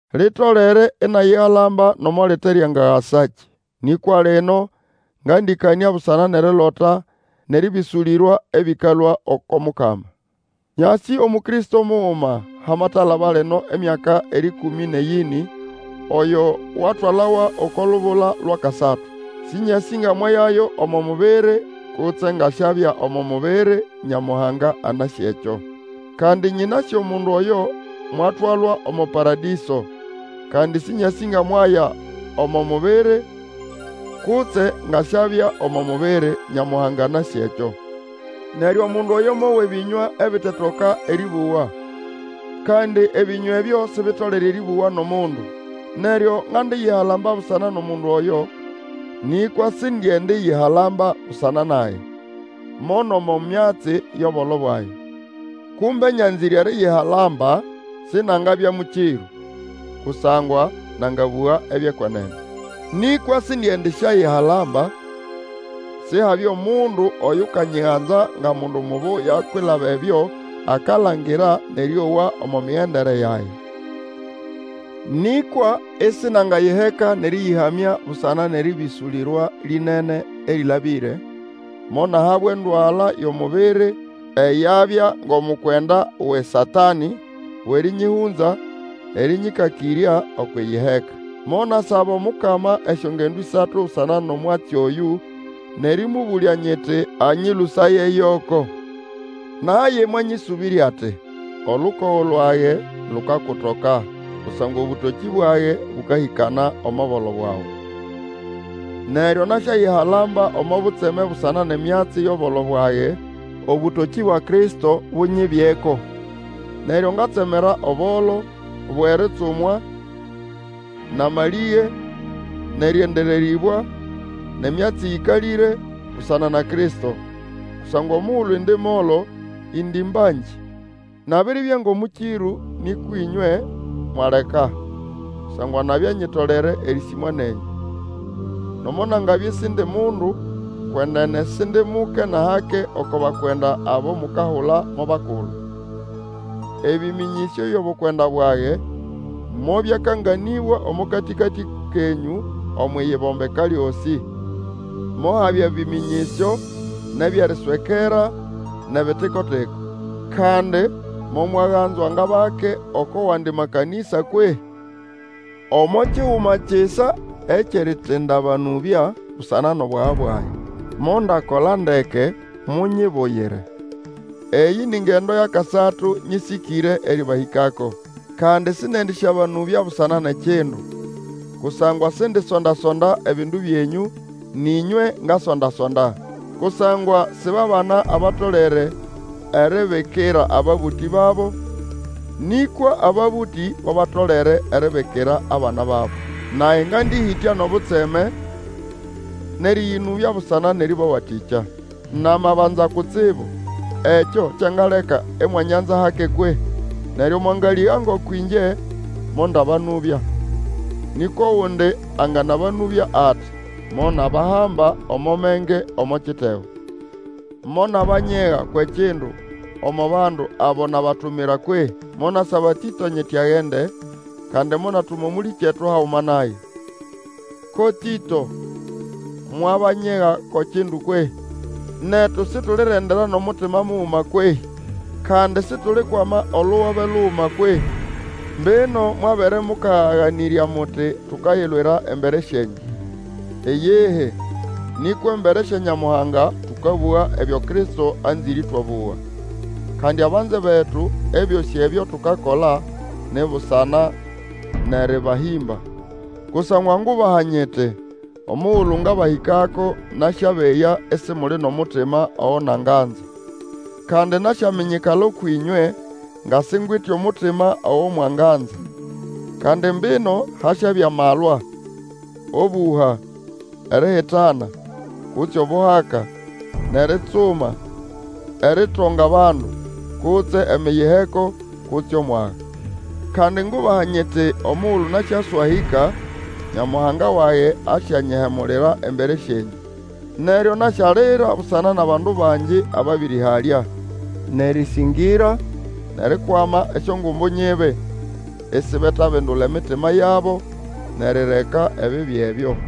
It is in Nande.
Litolere inayihalamba, nomo lite lyangagasakĩ. Nĩkwa lino ngandĩkanĩa busana nʼerilota nʼerĩbĩsũlĩrwa ebĩkalũa oko Mukama. Nyasĩ Omukristo muguma, hamatalaba lino emyaka erĩkũmĩ nʼeyĩnĩ, oyo watwalawa oko lubula lwʼakasatu. (Sĩnyasĩ nga mwayayo omo mubiri, kutse nga siabya omo mubiri, Nyamuhanga anasĩ ekyo.) Kandi nyĩnasĩ omundu oyo mwatwalwa omo Paradĩso (kandi Sĩnyasĩ nga mwaya omo mubiri, kutse nga siabya omo mubiri, Nyamuhanga anasĩ ekyo). Neryo omundu oyo mowa ebĩnywa ebitetoka erĩbũgwa, kandi ebĩnywa ebyo sibitolere erĩbũgwa nʼomundu. Neryo ngandiyihalamba busana nʼomundu oyo; nĩkwa sindiendiyihalamba busana nage, mo nʼomo myatsi yʼobolo bwage. Kumbe nyanzĩre eriyihalamba, sinangabya mũkĩrũ, kusangwa nangabũga ebyʼekwenene. Nĩkwa sindiendisyayihalamba, Sihabye omundu Oyukanyiganza nga mundu mubuya kwilaba ebyo akalangira nʼerĩowa omo migendere yage. Nĩkwa isinangayiheka nʼerĩyĩhamya busana nʼerĩbĩsũlĩrwa lĩnene erĩlabĩre, monahabwa endwala yʼomubiri eyabya ngʼomukwenda wʼeSatanĩ wʼerĩnyĩhũnza, erĩnyĩkakĩrya okwʼiyiheka. Monasaba Omukama esyongendo ĩsatu busana nʼomwatsi oyũ nʼerĩmũbũlya nyiti anyĩlũsaye yoko. Naye mwanyĩsũbĩrya ati, Olukogo lwage lukakutoka, kusangwa obũtokĩ bwage bũkahĩkana omo bolo bwawe. Neryo nasyayihalamba omo butseme busana nʼemyatsi yʼobolo bwage, obũtokĩ bwa Kristo bunyibyeko. Neryo ngatsemera obolo, bwʼeritsumwa, nʼamalĩge, nʼerĩendererĩbwa, nʼemyatsi eyĩkalĩre, busana na Kristo. Kusangwa omugulu indi molo, indi mbangĩ. Nabiribya ngʼomũkĩrũ, nĩkwa ĩnywe mwaleka, kusangwa nabya nyitolere erĩsĩmwa nenyũ. Nomo nangabya isindi mundu, kwenene Sindi muke nʼahake oko bakwenda abo mukahula mo bakulu. Ebĩmĩnyĩsyo byʼobukwenda bwage mobyakanganĩbwa omo katĩkatĩ kenyũ Omwʼiyibombeka lyosĩ. Mohabya ebĩmĩnyĩsyo, nʼebyʼeriswekera nʼebitikotiko. Kandi momwaganzwa ngʼabake oko wandi makanĩsa kwehĩ? Omo kiguma kisa ekyʼeritindabanũbya busana nʼobwaga bwage. Mondakola ndeke, munyibuyire. Eyĩ ni ngendo yʼakasatu nyĩsĩkĩre erĩbahĩkako, kandi sĩndĩendĩsyabanũbya busana nʼekindu; kusangwa sindisondasonda ebindu byenyũ, nʼĩnywe ngasonda-sonda. Kusangwa si ba bana abatolere eribikira ababũtĩ babo, nĩkwa ababũtĩ bo batolere eribikira abana babo. Nage ngandĩhĩtya nʼobutseme nʼerĩyĩnũbya busana nʼerĩbawatĩkya. Namabanza kutsibu, ekyo kyangaleka imwanyanza hake kwehĩ? Neryo mwanganalĩga ngoko ĩngye mondabanũbya, nĩkwa ogundi anganabũga ati, monabahamba omo menge omo kitego. Monabanyega kwʼekindu omo bandu abo nabatumira kwehĩ? Monasaba Tĩto nyiti agende, kandi monatuma Omũlĩkyetu haguma naye. Ko Tĩto mwabanyega ko kindu kwehĩ? Netu situlirendera nʼomutima muguma kwehĩ? Kandi situlikwama olugobe luguma kwehĩ? Mbino mwabere mũkaganĩrya muti tukayilwira embere syenyũ. Iyihi! Nĩkwa embere sya Nyamuhanga, tũkabũga ebyo Kristo anzĩre ĩtwabũga. Kandi abanze betu, ebyosĩ ebyo tukakola ni busana nʼeabahĩmba. Kusangwa ngubaha nyiti, omugulu ngabahĩkako, nasyabeya isimuli nʼomutima ogo nanganza, kandi nasyaminyikala ũkwʼĩnywe nga singwite omutima ogo mwanganza. Kandi mbino hasyabya malwa, obũha, erihitana, kutse obuhaka, nʼeritsuma, eritonga bandu, kutse emiyiheko, kutse omwaga. Kandi ngubaha nyiti omugulu nasyaswahĩka, Nyamuhanga wage asyanyihemulira embere syenyũ. Neryo nasyalira busana nʼabandu bangi ababĩrĩhalya, nʼerĩsĩngĩra, nʼerikwama esyongumbu nyibi, isibetabindula emitima yabo nʼerireka ebibi ebyo.